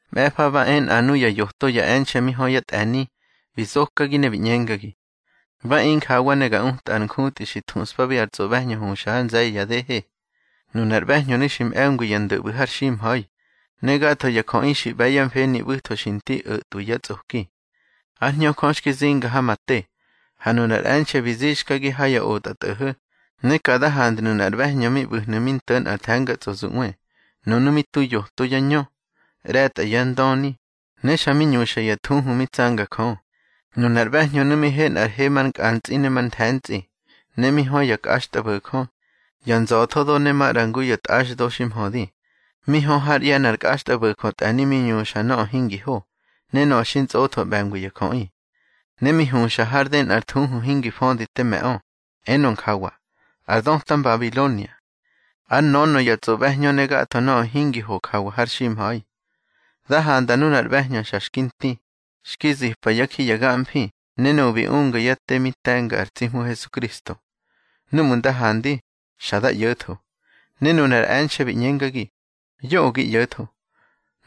Mꞌe̱fa ba e nꞌa nuya yoto e̱nxe̱ mi hö ya tꞌe̱ni, bi zokagi ne bi ꞌñengagi: —Ba e injawa ne ga utꞌa ar njutꞌi xi thuꞌspabi ar tsꞌoꞌbe̱hñö huxa ha nze̱ye̱ ya dehe. Nunar ꞌbe̱hñönu̱ xi mꞌe̱ngwi ya ndö ꞌbu̱ har ximha̱i, ne gatho ya jöꞌi xi ꞌbe̱ yá mfeni ꞌbu̱tho xi nti o̱tꞌwi ya tsꞌoki. Ár Hñö Jö xki zinga ha ma te, ha nunar e̱nxe̱ bi zixkagi ha ya otꞌatꞌo̱ho̱, ne ka da handnu̱ nꞌar ꞌbe̱hñö mi ꞌbu̱hnu̱ mi nto̱ nꞌar the̱ngatsꞌozuꞌwe. Nunu̱ mi tu yoto yá ñö, ꞌre̱tꞌa yá ndöni, ne xa mi ñuxa ya thuhu mi tsanga Jö. Nunar ꞌbe̱hñönu̱ mi he nꞌar he mar nkꞌantsꞌi ne mar nthe̱ntsꞌi, ne mi hö ya kꞌaxtꞌabo̱jö, ya nza̱thodo ne maꞌra ngu ya tꞌaxdo xi mhödi. Mi hö hár ꞌye̱ nꞌar kꞌaxtꞌabo̱jö tꞌe̱ni mi ñuxa nöꞌö hingi ho, ne nöꞌö xi ntsꞌotho ꞌbe̱ngwi ya jöꞌi. Ne mi huxa hár dë nꞌar thuhu hingi födi te me̱ꞌö, enö njawa: Ar döta Mbabilonia, ár nönö ya tsꞌoꞌbe̱hñö ne gatho nöꞌö hingi ho jawa har ximha̱i. Da handa nunar ꞌbe̱hñö xa xki nti, xki zipa yá ji ya gamfi ne nuꞌu̱ bi unga yá te mi te̱nga ar tsi Hmu Hesukristo. Númꞌu̱ nda handi, xa da ꞌyo̱tho. Ne nunar e̱nxe̱ bi ꞌñengagi: —Yoꞌö gi ꞌyo̱tho.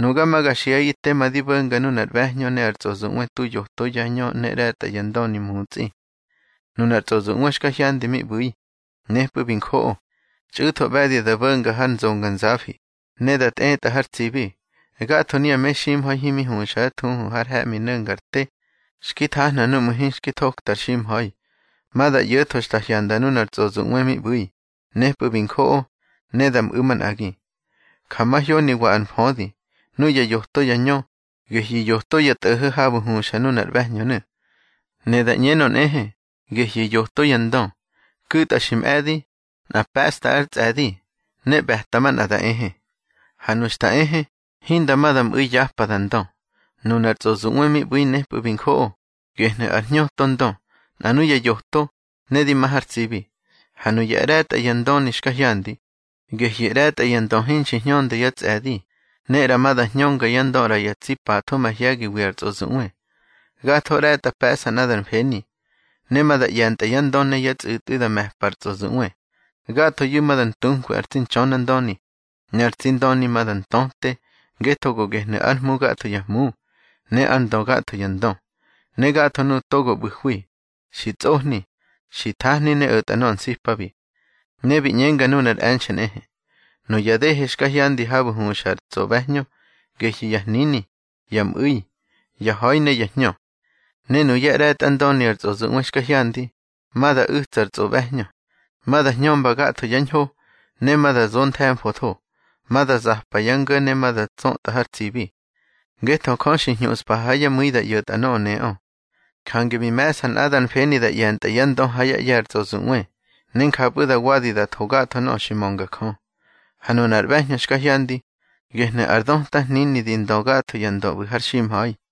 Nuga ma ga xiꞌaꞌi tema di bo̱nga nunar ꞌbe̱hñö ne ar tsꞌozuꞌwe tu yoto yá ñö ne ꞌre̱tꞌa yá ndöni mutsꞌi. Nunar tsꞌozuꞌwe xka hyandi mi ꞌbu̱i, nepꞌu̱ bi njoꞌo, txꞌu̱tho ꞌbe̱di da bo̱nga har nzonganzafi, ne da tꞌetꞌa har tsibi. Gatho nuya meximha̱i himi huxa yá thuhu har he̱ꞌmi no̱nga ar te, xki thahna núꞌmu̱ hinxki thokta ar ximha̱i, ma da ꞌyo̱tho xta hyanda nunar tsꞌozuꞌwe mi ꞌbu̱i, nepꞌu̱ bi njoꞌo, ne da mꞌu̱ manꞌagi. Ja mahyoniwa ar mfödi: Nuya yoto yá ñö, gehyu̱ yoto ya tꞌo̱ho̱ habu̱ huxa nunar ꞌbe̱hñönu̱. Ne da ꞌñenö nꞌehe, gehyu̱ yoto ya ndö. Ku̱tꞌa xi mꞌe̱di, nꞌa pe̱ꞌsta ár tsꞌe̱di, ne ꞌbe̱ta manꞌa da ehe. Ha nu xta ehe, hinda ma da mꞌu̱i yapa da ndö. Nunar tsꞌozuꞌwe mi ꞌbu̱i nepꞌu̱ bi njoꞌo, gehnu̱ ár hñöto ndö, nꞌa nuya yoto, ne di ma har tsibi. Ha nuya ꞌre̱tꞌa ya ndöni xka hyandi, gehyu̱ ꞌre̱tꞌa ya ndö hinxi hñönda yá tsꞌe̱di, ne ꞌra ma da hñönga yá ndö ꞌra ya tsi patho mahye̱giwi ar tsꞌozuꞌwe. Gatho ꞌre̱tꞌa pe̱ꞌsa nꞌadar mfeni, ne ma da ꞌye̱ntꞌa yá ndö ne yá tsꞌu̱tꞌwi da me̱pa ar tsꞌozuꞌwe. Gathoyu̱ ma da ntunkwi ar tsi Ntxönandöni, ne ar tsi Ndöni ma da ntöte, ngetho go gehnu̱ ár Hmu gatho ya hmu, ne ár Ndö gatho ya ndö. Ne gatho nuꞌu̱ togo ꞌbu̱hwi, xi tsꞌohni, xi thahni ne o̱tꞌa nöꞌö nsipabi. Ne bi ꞌñengagi nunar e̱nxe̱ nꞌehe: —Nuya dehe xka hyandi habu̱ huxa ar tsꞌoꞌbe̱hñö, gehyu̱ ya hnini, ya mꞌu̱i, ya ha̱i ne ya hñö. Ne nuyá ꞌre̱tꞌa ndöni ar tsꞌozuꞌwe xka hyandi, ma da u̱tsa ar tsꞌoꞌbe̱hñö, ma da hñömba gatho yá ñho, ne ma da zo nthe̱mfotho. Ma da zapa yá ngo̱ ne ma da tsötꞌa har tsibi. Ngetho Jö xi hñuꞌspa ha yá mu̱i da ꞌyo̱tꞌa nöꞌö neꞌö. Jange bi me̱ꞌsa nꞌadar mfeni da ꞌye̱ntꞌa yá ndö ha yá ꞌye̱ ar tsꞌozuꞌwe, ne njapꞌu̱ da wadi da tho gatho nöꞌö xi mönga Jö. Ha nunar ꞌbe̱hñö xka hyandi, gehnu̱ ar döta hnini di ndö gatho ya ndö ꞌbu̱ har ximha̱i.